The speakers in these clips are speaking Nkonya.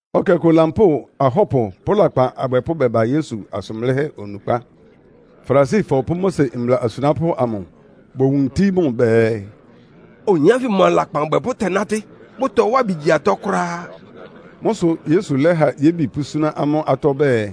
Ɛkɛ ɔkʋ lampóo ahɔ́pʋ pʋ́ lakpan abwɛpʋ́ bɛba Yesu asʋn blɩ́hɛ́ onukpá. Farisifɔ pʋ́ Mose mbla asunápʋ́ amʋ bowuntí mʋ bɛɛ, “Oyin ánfɩ mʋa lakpan abwɛpʋ́ tɛ́nátɩ́, bʋtɔwá ɩbɩ gyi atɔ́ kʋ́ráá.” Mʋ́ sʋ Yesu lɛ́ha yébi pʋ́súná amʋ́ atɔ́ ɔbɛ́ɛ,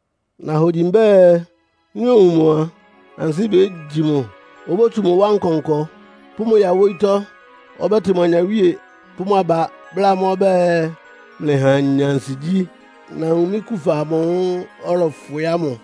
Nahogyi mbɛ́ɛ, nɩ́ owun mʋ a, ansɩ́ bégyi mʋ, obótsu mʋ wá nkɔnkɔ, pʋ́ mʋ ya wóyítɔ́. Ɔbɛ́tɩ mʋ anyawíe pʋ́ mʋ aba, bláa amʋ́ ɔbɛ́ɛ, ‘Mlɩha anya ansigyí. Nawun mɩ́ kufa amʋ́ʋ́ ɔlɔfwɩ ámʋ!’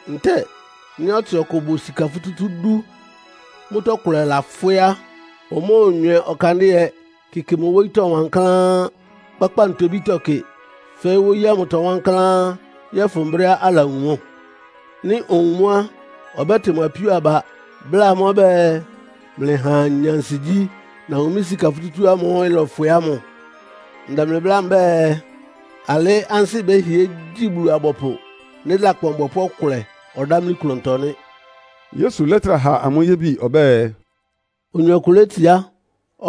“Ntɛ́ɛ nɩ́ ɔtsɩ ɔkʋ bʋ sika futútú dú, mʋ́tɔ́ kʋlɛ lafwɩ́ á, omóonywɛ ɔkandɩ́ɛ kɩkɩ mʋ wóyítɔ́ wankláán, kpákpá ntobítɔ́ kɩ, fɛ́ɩ́ wóyí ámʋtɔ wankláán yɔ́fʋn brɛ́á alawun mʋ́? Nɩ́ owun mʋ́ á, ɔbɛ́tɩ mʋ apíó aba, bláa amʋ́ ɔbɛ́ɛ, ‘Mlɩha anya ansigyí. Nawun mɩ́ sika futútú ámʋ́ʋ́ ɩlɔfwɩ ámʋ. Ndɛ mlɩ bláa mbɛ́ɛ, alɩ́ ansɩ́ bɛ́hɩɛ gyi Bulu-abɔpʋ nɩ́ lakpan ɔbwɛpʋ́ ɔkʋlɛ ɔdámlí klʋntɔ nɩ́.’” Yesu lɛ́trá ha amʋ́ yébi ɔbɛ́ɛ, “Oyin ɔkʋ létsiá,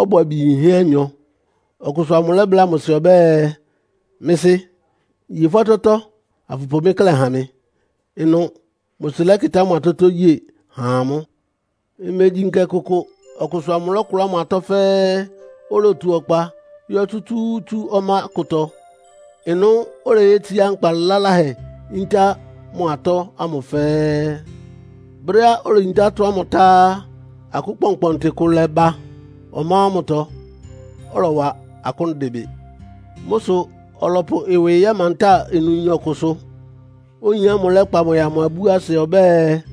ɔbʋ abi yinhɛ́ anyɔ. Ɔkʋsʋ amʋ lɛ́bláa mʋ sɩ ɔbɛ́ɛ, ‘Mɩ́ sɩ́, ye fʋ́ atɔ́tɔ́, afʋpʋ mɩ́ klɛ́ ha mɩ.’ Ɩnʋ mʋ sɩ lɛ́kɩtá mʋ atɔ́tɔ́ ye há amʋ́. Imegyi nkɛ kʋkʋ ɔkʋsʋ amʋ lɔ́kʋlá mʋ atɔ́ fɛ́ɛ́, olotu ɔkpa yɔ́ tsútsúútsú ɔmá kʋtɔ. Ɩnʋ oleyétsiá nkpa laláhɛ yíntá mʋ atɔ́ ámʋ fɛ́ɛ́. Brɛ́á oleyintá atɔ́ ámʋ tá á, akʋ́n kpɔnkpɔntɩ kʋ lɛ́ba ɔmá ámʋtɔ, ɔlɔwa akʋ́n dɩ bɩ. Mʋ́ sʋ ɔlɔpʋ ɩwɩ yɛ́mantá ɩnʋyin ɔkʋsʋ, oyin ámʋ lɛ́kpa mʋ yáa mʋ ibúasɩ ɔbɛ́ɛ,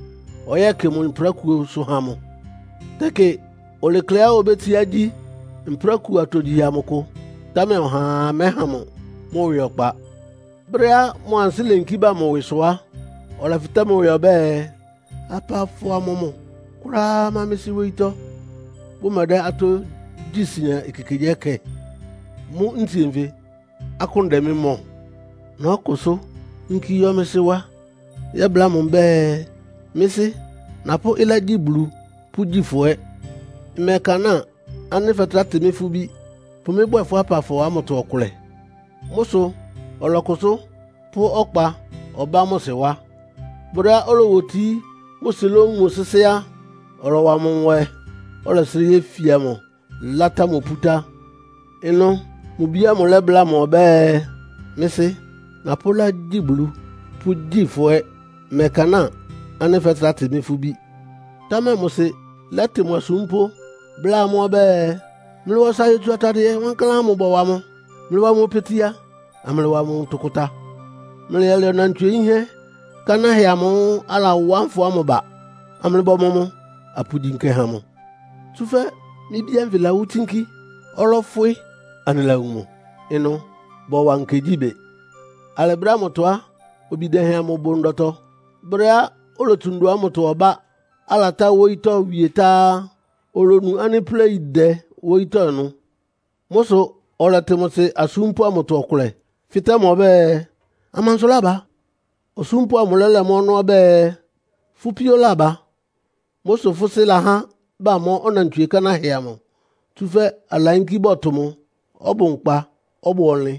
ɔyɛ́kɩ mʋ mprákuosʋ ha mʋ. Tɛkɩ olekleá obétsiá gyi mprákuo atogyihɛ amʋ kʋ, támɛ ɔhaa mɛ́ha mʋ mʋ́ ɩwɩ ɔkpa. Brɛ́á mʋ ansɩ́ leyinkí ba mʋ ɩwɩsʋ á, ɔlɛfɩtɛ́ mʋ ɩwɩ ɔbɛ́ɛ, ‘Apafɔ amɔmʋ kʋ́ráá má mɩ́ sɩ́ wóyítɔ́, bʋmɛdɛ́ atɔ́ gyí sian ekekegyíɛkɛ? Mʋ́ ntsie nfɩ, akʋ́n dɛ mɩ́ mɔ? Nɔ́kʋsʋ́ yínkí yɔ́ mɩ́ sɩ́ wá, yɛ́bláa mʋ mbɛ́ɛ, mɩ́ sɩ́, napʋ́ ɩlá gyí Bulu, pʋ́gyi fʋ́ ɛ́. Mmɛkanáa ánɩ́ fɛ́trá tɩ mɩ́ fʋ́ bí. Pʋ mɩ́ bwɛ́ɛ fʋ́ apafɔ ámʋtɔ ɔkʋlɛ.’ Mʋ́ sʋ ɔlɔkʋsʋ́ pʋ́ ɔkpa ɔbá mʋ sɩ wá. “Brɛ́á olowotií, mʋ sɩ lówun mʋ sɩ́sɩ́ á, ɔlɔwa mʋ nwɛ, ɔlɛsrɩ́ yéfia mʋ, látá mʋ pútá. Ɩnʋ mʋ bi ámʋ lɛ́bláa mʋ ɔbɛ́ɛ, ‘Mɩ́ sɩ́, napʋ́ ɩlá gyí Bulu, pʋ́gyi fʋ́ ɛ́. Mmɛkanáa ánɩ́ fɛ́trá tɩ mɩ́ fʋ́ bí.’ Támɛ mʋ sɩ lɛ́tɩ mʋ asúmpʋ́, bláa amʋ́ ɔbɛ́ɛ, ‘Mlɩwa ɔsa yotsu atadɩɛ wankláán ámʋ bɔwa mʋ. Mlɩwa mʋ opetia, amlɩwa mʋ ntʋkʋta. Mlɩyɛlɛ ɔnantswie yínhɛ́ kánáhɛ amʋ́ʋ́ alawá nfɔ ámʋ ba, amlɩbɔmɔ mʋ, apʋgyi nkɛ ha mʋ. Tsúfɛ́ mɩ́ bí ánfɩ lawú tsínkí. Ɔlɔfwɩ, anɩlawun mʋ.’ Ɩnʋ bɔwa nkɛ gyí bɩ. “Alɩ brɛ́ ámʋtɔ á, obi dɛhɛn amʋ bʋ ndɔtɔ. Brɛ́á olotsu ndɔ ámʋtɔ ɔbá, alatá wóyítɔ́ wie tá á, olonu ánɩ́ pléi dɛ wóyítɔ́ ɩnʋ. Mʋ́ sʋ ɔlɛtɩ mʋ sɩ asúmpʋ́ amʋtɔ ɔkʋlɛ, fɩ́tɛ́ ɔbɛ́ɛ, ‘Amansʋ lába?’ Osúmpʋ́ amʋ lɛ́lɛ mʋ́ ɔnɔ́ ɔbɛ́ɛ, ‘Fʋ́ píó laba. Mʋ́ sʋ fʋ́ sɩ́ lahá bamɔ́ ɔnantswie kánáhɛ amʋ, tsúfɛ́ alayínkí bɔtʋ mʋ, ɔbʋ nkpa, ɔbʋ ɔnlɩn.’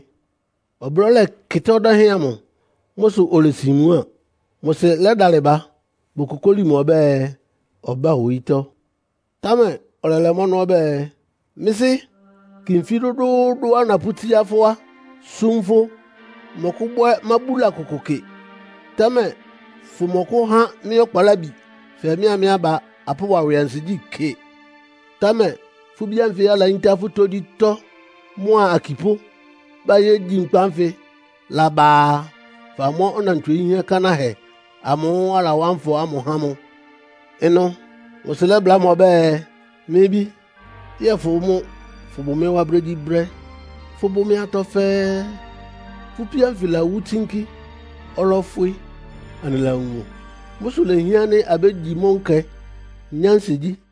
“Ɔblɔ́ lɛkɩtá ɔdɛ́hɛn amʋ. Mʋ́ sʋ olesin mmuáa. Mʋ sɩ lɛ́dalɩ ba bokokóli mʋ ɔbɛ́ɛ, ɔbá wóyítɔ́. Támɛ ɔlɛlɛ mʋ́ ɔnɔ́ ɔbɛ́ɛ, ‘Mɩ́ sɩ́, kɩ nfí dʋ́dʋ́ʋ́dʋ́á napʋ́tsíá fʋ́ wá súm fʋ́. Mmɔkʋ́bwɛ́ mábúla kʋkʋ kɩ. Támɛ fʋmɔkʋ́há mɩ́ ɔkpalábi fɛɛ mɩ́a mɩ́ aba apʋ́wa ɩwɩ ansigyí kɩ. Támɛ fʋ́ bí ánfɩ alayíntá fʋ́ tógyítɔ́, mʋa akipʋ́ bayégyi nkpa ánfɩ mʋ́ laba a, famɔ́ ɔnantswie yinhɛ́ kánáhɛ amʋ́ʋ́ alawá nfɔ ámʋ há mʋ!’ Ɩnʋ mʋ sɩ lɛ́bláa mʋ ɔbɛ́ɛ, ‘Mɩ́ bí, yɛ́ɛ fʋ́ mʋ́ fʋ́bʋ mɩ́ wá brégyíbrɛ́. Fʋ́bʋ́ mɩ́ atɔ́ fɛ́ɛ́. Fʋ́ píó ánfɩ lawú tsínkí. Ɔlɔfwɩ, anɩlawun mʋ. Mʋ́ sʋ lehián ánɩ́ abégyi mʋ́ nkɛ, nyá ansigyí.’”